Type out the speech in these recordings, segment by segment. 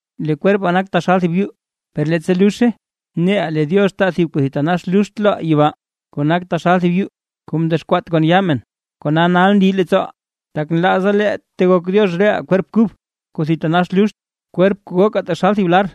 Lee kwerpaa nak taxal thib yuu; per leettsa luzhe neʼaa lee Diox taa thib kuu thitanax luxt loʼaa yibaa, kuu nak taxal thib yuu kuu mdexkwaat kon yaa men. Kona nal ndi leettsooʼaa, tak nlaaza lee tegok Diox reʼaa kwerp kub kuu thitanax luxt, kwerp kuu gokaa taxal thib lar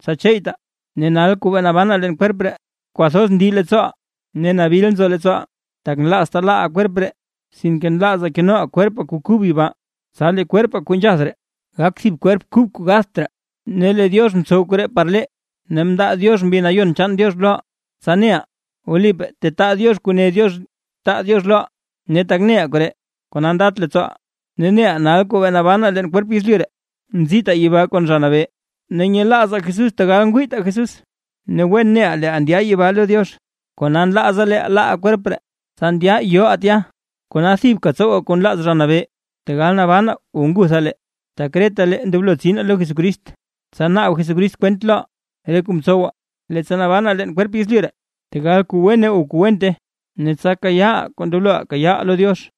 tsa cheeytaa. Ne nal kuu bee nabanaa leen kwerp ree, kwathoz ndi leettsooʼaa ne nabil nzo leettsooʼaa, tak nlaaztaa laaʼaa kwerp ree, sinke nlaazaa kenoʼaa kwerpaa kuu kub yibaa, tsa lee kwerpaa kuu nzhath ree, gak thib kwerp kub kuu gatht raa. Ne lee Diox mtsow koree par lee ne mndaa Diox Mbi Nayon chaan Diox loʼaa, tsa neʼaa wlipaa tetaa Diox kuu ne Diox taa Diox loʼaa. Ne tak neʼaa koree kona ndat leettsooʼaa, ne neʼaa nal kuu nabanaa leen kwerp yezlyu ree, nzitaa yibaa kon Zha Nabee. Ne nyelaazaa Jesús tegal ngwiitaa Jesús. Ne wen neʼaa leeʼaa ndya yibaa lo Diox, kona nlaazaa lee laaʼaa kwerp ree, tsa ndyaʼaa yoʼaa tya. Kona thibka ndoblo tsowaa kuu nlaaz Zha Nabee, tegal nabanaa o ngutha lee. Tak retalee ndoblo tsinaa lo Jesucrist, tsa naab Jesucrist kwent loʼaa re kuu mtsowaa, leettsa mbanaa leen kwerpaa yezlyu ree, tegal kuu wene o kuu wente, ne tsa kayaaʼaa kuu ndoblo kayaaʼaa lo Diox.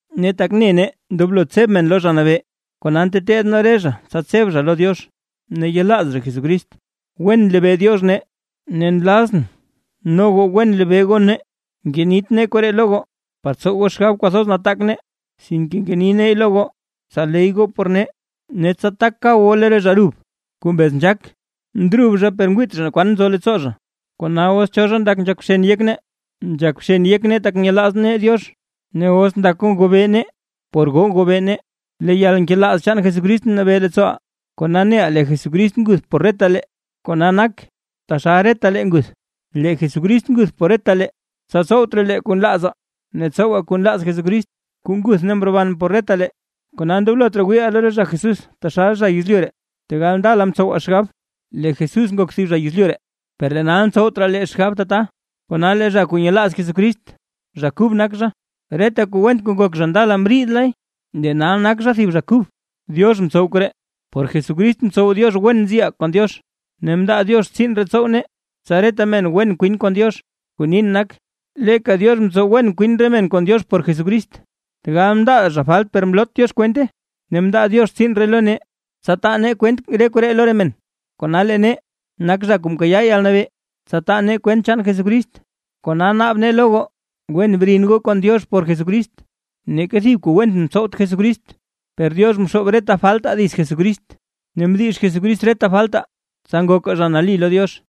Ne tak ne nee ndoblo tseb men lo Zha Nabee, kona nteteed nee re zha tsa tseb zha lo Diox ne yelaaz zha Jesucrist. Wen nlebee Diox nee ne nlazʼn no goo wen lebee goo nee. Ngenit nee koree lo goo par tsow goo xgab kwathoz nataak nee, sinke ngeni neey lo goo, tsa ley goo por nee, ne tsa tak kab goo lo re zha brub kuu mbez nzhaak, ndrub zha per ngwiit zha naa kwan nzo leettsoo zha. Kona os cho zha ndak nzhak bxen yek nee, nzhak bxen yek nee tak nyelaaz nee Diox; ne os ndak goo ngobee nee por goo ngobee nee. Lee yalnkelaaz chaan Jesucrist nabee leettsooʼaa, kona neʼaa lee Jesucrist nguth por retalee, kona nak taxal retalee nguth. Lee Jesucrist nguth por retalee, tsa tsowt raa lee kuu nlaazaa ne tsowaa kuu nlaaz Jesucrist, kuu nguth ne mroban por retalee. Kona ndoblot raa wiiʼaa lo re zha Jesús taxal zha yezlyu ree; tegal ndala mtsowaa xgab lee Jesús ngok thib zha yezlyu ree, per lee nal ntsowt raa lee xgab tata. Kona lee zha kuu nyelaaz Jesucrist, zha kub nak zha; reta kuu went kuu ngok zha ndala mriidle, lee nal nak zha thib zha allí kub. Diox mtsow koree. Por Jesucrist mtsow Diox wen nziʼaa kon Diox. Ne mndaa Diox tsiin ree tsow nee, tsa reta men wen kwin kon Diox. Kuu nin nak, leeka Diox ntsow wen kwin re men kon Diox por Jesucrist, tegal mndaa zha falt per mlot Diox kwente; ne mndaa Diox tsiin ree lo nee, tsa taa nee kwent re koree lo re men. Kona lee nee nak zha kuu mkayaa yalnabee, tsa taa nee kwent chaan Jesucrist, kona naab nee lo goo wen brin goo kon Diox por Jesucrist. Neeka thib kuu went mtsowt Jesucrist, per Diox mxoob reta faltaa dits Jesucrist, ne mdix Jesucrist re faltaa, tsa ngokaa zha nali lo Diox.